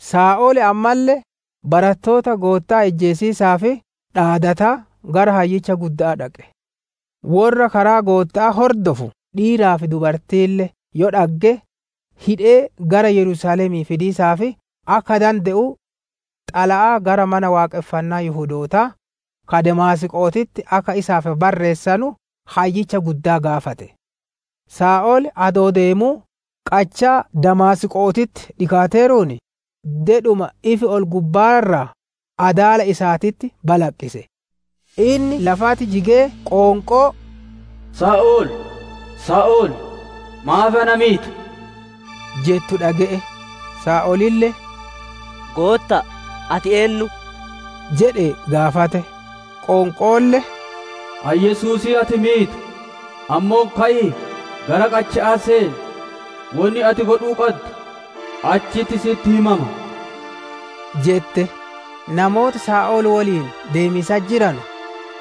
Saa'ol ammalle barattoota Gootta'aa ijjeesiisaaf dhaadataa, gara Hayyicha gudda'aa dhaqe. Worra karaa Gootta'aa hordofu dhiiraa fi dubartiille yoo dhagge, hidhee gara Yerusaalemii fidiisaaf akka dande'u, xalayaa gara Mana Waaqonfannaa Yihudootaa ka Damaasqo'oo akka isaaf barreessu, Hayyicha Guddaa gaafate. Saa'ol adoo deemuu qachaa Damaasqo'ootitti dhikaateeruun, dedhuma ifi ol-gubba'aa irraa adaala isaatitti balaqqise. Inni lafatti jigee qoonqoo, «Saa'ol, Saa'ol maaf na miita?» jettu dhage'e. Saa'olille, «Gootta'a, ati eennu?» jedhee gaafate. Qoonqoolle, «Ani Yesuusii ati miitu; ammoo, ka'ii gara qacha'aa seen. Wonni ati godhuu qaddu achitti si'itti himama» jette. Namooti Saa'ol woliin deemiisatti jiranu,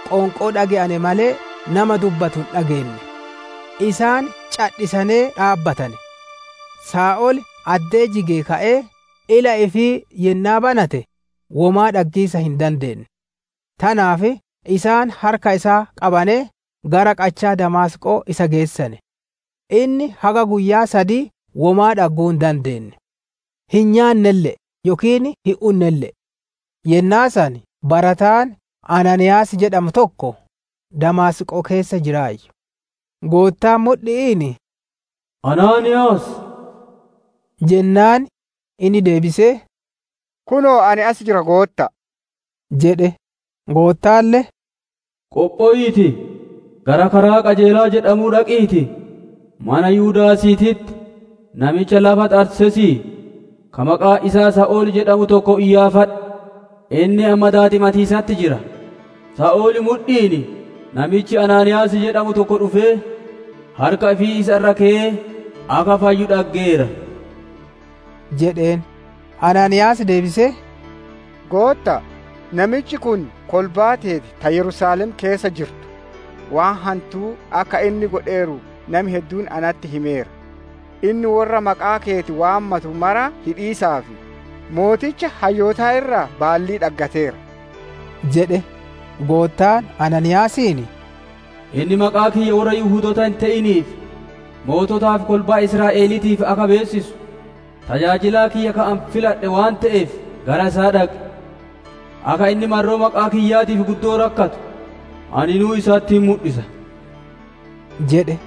qoonqoo dhage'ane malee, nama dubbatu hin dhaggine; isaan cadhisanee dhaabbatane. Saa'ol addee jigee ka'ee ila ifii yennaa banate, womaa dhaggiisaaf hin dandeenne. Tanaaf isaan harka isaa qabanee, gara qachaa Damaasqo'oo isa geessane. Inni haga guyyaa sadii womaa dhagguu hin dandeenne; hin nyaannelle'e yookiin hin unnelle'e. Yennaa san barataan Anaaniiyaas jedhamu tokko, Damaasqoo keessa jiraayyu. Goottaan mudhi'iin «Anaaniiyaas» jedheen. Innille deebisee, «Kunoo ani as jira, Gootta'a» jedhe. Goottaalle, «Qophowiitii, gara karaa ‹Qajeelaa› jedhamu dhaqiitii, mana Yudaasiititti namicha lafa Xarseesii, ka maqaan isaa Saa'ol jedhamu tokko iyyaafadhu. Inni amma daadimatiisatti jira; Saa'ol mudhi'iin namichi Anaaniiyaas jedhamu tokko dhufee, harka ifii isa irra keyee akka fayyu dhaggeera» jedheen. Anaaniiyaas deebisee, «Gootta'a, namichi kun kolbaa teeti ta Yerusaalem keessa jirtu waan hantuu akka inni godheeru nami hedduun natti himeera. Inni worra maqaa keeti waammatu mara hidhiisaaf, sooreyyii hayyootaa irraa baallii dhaggateera» jedhe. Goottaan Anaaniiyaasiin, «Inni maqaa kiyya worra Yihudoota hin te'iniif, moototaa fi kolbaa Israa'eliitiif akka beessisu, tajaajilaa kiyya ka ani filadhe waan te'eef gara isaa dhaqi. Akka inni marroo maqaa kiyyaatiif guddoo rakkatu, aninuu isatti hin mudhisa» jedhe.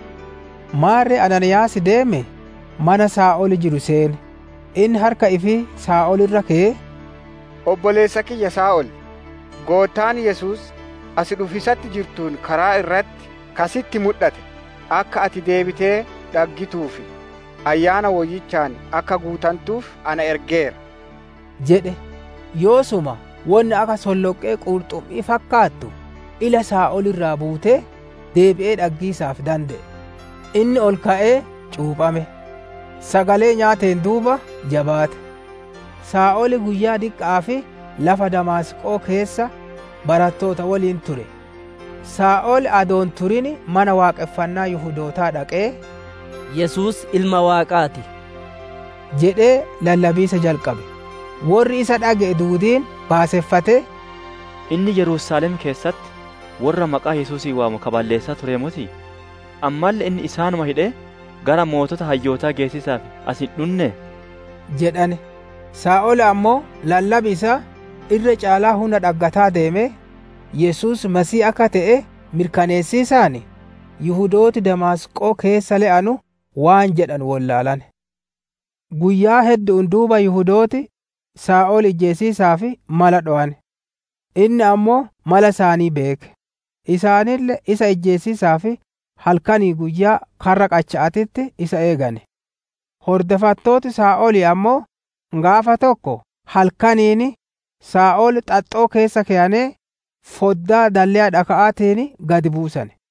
Maarre Anaaniiyaas deemee, mana Saa'ol jiru seene; inni harka ifii Saa'ol irra keyee, «Obboleessa kiyya Saa'ol, Goottaan Yesuus, as dhufiisatti jirtuun karaa irratti ka si'itti mudhate, akka ati deebitee dhaggituu fi Ayyaana Woyyichaan akka guutantuuf ana ergeera» jedhe. Yoosuma wonni akka solloqqee qurxummi'ii fakkaattu, ila Saa'olii irraa buutee, deebi'ee dhaggiisaaf dande'e. Inni ol ka'ee cuuphame; sagalee nyaateen duuba jabaate. Saa'ol guyyoota diqqa'aaf lafa Damaasqo'oo keessa barattoota woliin ture. Saa'ol adoo hin turin mana Waaqonfannaa Yihudootaa dhaqee, «Yesuus Ilma Waaqaa ti» jedhee lallabiisa jalqabe. Worri isa dhage'e duudiin baaseffatee, «Inni Yerusaalem keessatti worra maqaa Yesuusii waamu ka balleessaa turee motii? Ammalle inni isaanuma hidhee gara sooreyyii hayyootaa geessiisaaf as hin dhunnee?» jedhane. Saa'ol ammoo lallabi isaa irra caalaa hunna dhaggataa deemee, Yesuus Masiihii akka te'e mirkaneessinaan, Yihudooti Damaasqoo keessa le'anu waan jedhanu wollaalane. Guyyaa heddu'uun duuba Yihudooti, Saa'ol ijjeesiisaaf mala dhowane. Inni ammoo mala isaanii beeke. Isaanille isa ijjeesiisaaf halkanii fi guyyaa karra qacha'aatitti isa eegane. Hordofattooti Saa'olii ammoo, gaafa tokko halkaniin, Saa'ol xaxxoo keessa keyanee, foddaa dalleya dhaka'aatiin gad buusane.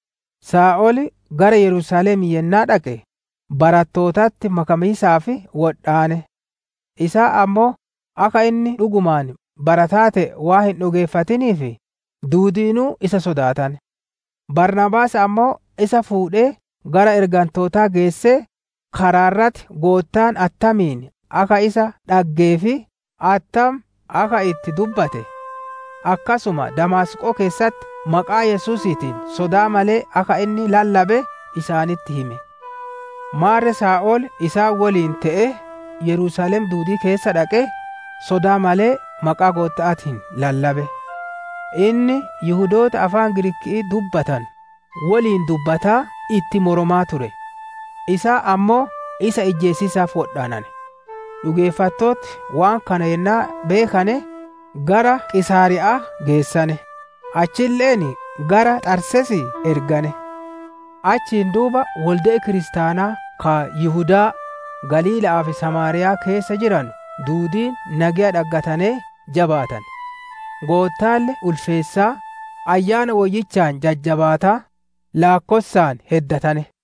Saa'ol gara Yerusaalemii yennaa dhaqe, barattootatti makamiisaaf wodhaane; isaan ammoo akka inni dhugumaan barataa te'e waan hin dhugeeffatiniif, duudiinuu isa sodaatane. Baarnaabaas ammoo isa fuudhee gara ergantootaa geessee, karaa irratti Goottaan attamiin akka isa dhaggee fi attam akka itti dubbate, akkasuma Damaasqoo keessatti maqaa Yesuusiitiin sodaa malee akka inni lallabe isaanitti hime. Maarre Saa'ol isaan woliin te'ee Yerusaalem duudii keessa dhaqee, sodaa malee maqaa Gootta'aatiin lallabe. Inni Yihudoota afaan Giriiki'ii dubbatanu woliin dubbataa itti moromaa ture; isaan ammoo isa ijjeesiisaaf wodhaanane. Dhugeeffattooti waan kana yennaa beekane, gara Qiisaariya'aa geessane; achille'een gara Xarseesii ergane. Achiin duuba wolde'i kiristaanaa ka Yihudaa, Galiilla'aa fi Samaariyaa keessa jiranu duudiin nageya dhaggatanee jabaatane; Goottaalle ulfeessaa, Ayyaana Woyyichaan jajjabaataa, laakkossaan heddatane.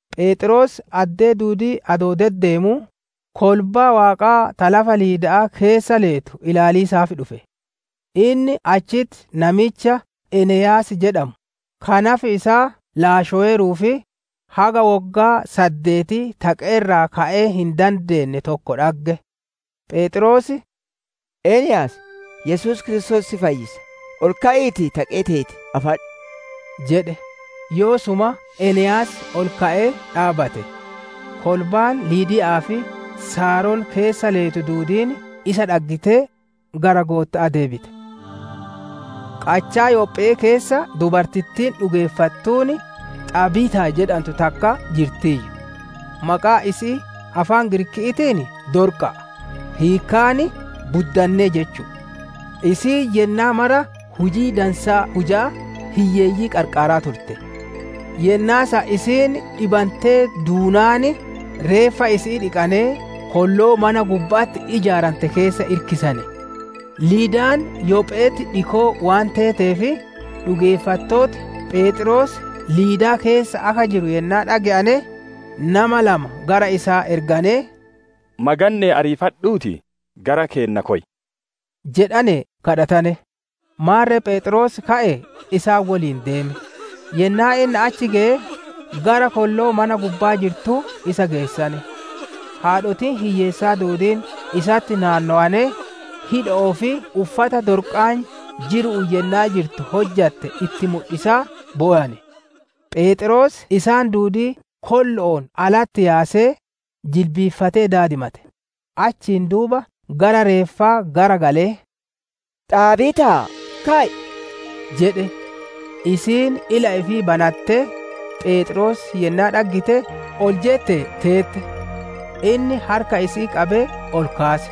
Pheexroos addee duudii adoo deddeemuu, kolbaa Waaqaa ta lafa Liidaa keessa leetu ilaaliisaaf dhufe. Inni achitti namicha Eneyaas jedhamu, ka nafi isaa laashoweeruu fi haga woggaa saddeetii taqee irraa ka'ee hin dandeenne tokko dhagge. Pheexroos, «Eneyaas, Yesuus Kiristoos si fayyisa ol ka'iitii, taqee teeti afadhu» jedhe. Yoosuma Eneyaas ol ka'ee dhaabbate. Kolbaan Liidaa fi Saaron keessa leetu duudiin isa dhaggitee, gara Gootta'aa deebite. Qachaa Yophee keessa dubartittiin dhugeeffattuun, Xaabiitaa jedhantu takka jirtiiyyu. Maqaan isi'ii afaan Giriikiitiin Dorqa'a; hiikkaan, «Buddannee» jechu'u. Isiin yennaa mara hujii dansaa hujaa, hiyyeeyyii qarqaaraa turte. Yennaa san isiin dhibantee duunaan, reeffa isi'ii dhiqanee kolloo mana gubba'atti ijaarantee keessa irkisane. Liidaan Yophe'etti dhikoo waan teeteef, dhugeeffattooti Pheexroos Liidaa keessa akka jiru yennaa dhage'ane, nama lama gara isaa erganee, «Maganne'ee ariifadhuutii gara keenna koy» jedhanee kadhatane. Maarre Pheexroos ka'ee isaan woliin deeme; yennaa inni achi geye, gara kolloo mana gubbaa jirtuu isa geessane. Haadhotiin hiyyeessaa duudiin isatti naannowanee, hidho'oo fi uffana Dorqaan jiru'uun yennaa jirtu hojjatte itti mudhisaa bowane. Pheexroos isaan duudii kollo'oon alatti yaasee, jilbiiffatee daadimate; achiin duuba gara reeffaa gara galee, «Xaabiitaa, ka'i!» jedhe. Isiin ila ifii banattee, Pheexroos yennaa dhaggite ol jettee teette. Inni harka isii qabee ol kaase.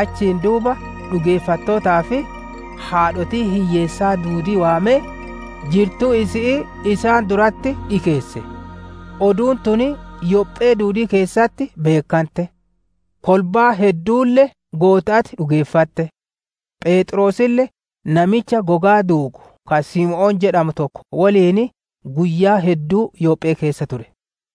Achiin duuba dhugeeffattootaa fi haadhotii hiyyeessaa duudii waamee, jirtuu isi'ii isaan duratti dhikeesse. Oduun tun Yophee duudii keessatti beekkante; kolbaan hedduulle Gootta'atti dhugeeffatte. Pheexroosille namicha gogaa duugu ka Simoon jedhamu tokko woliin, guyyaa hedduu Yoophee keessa ture.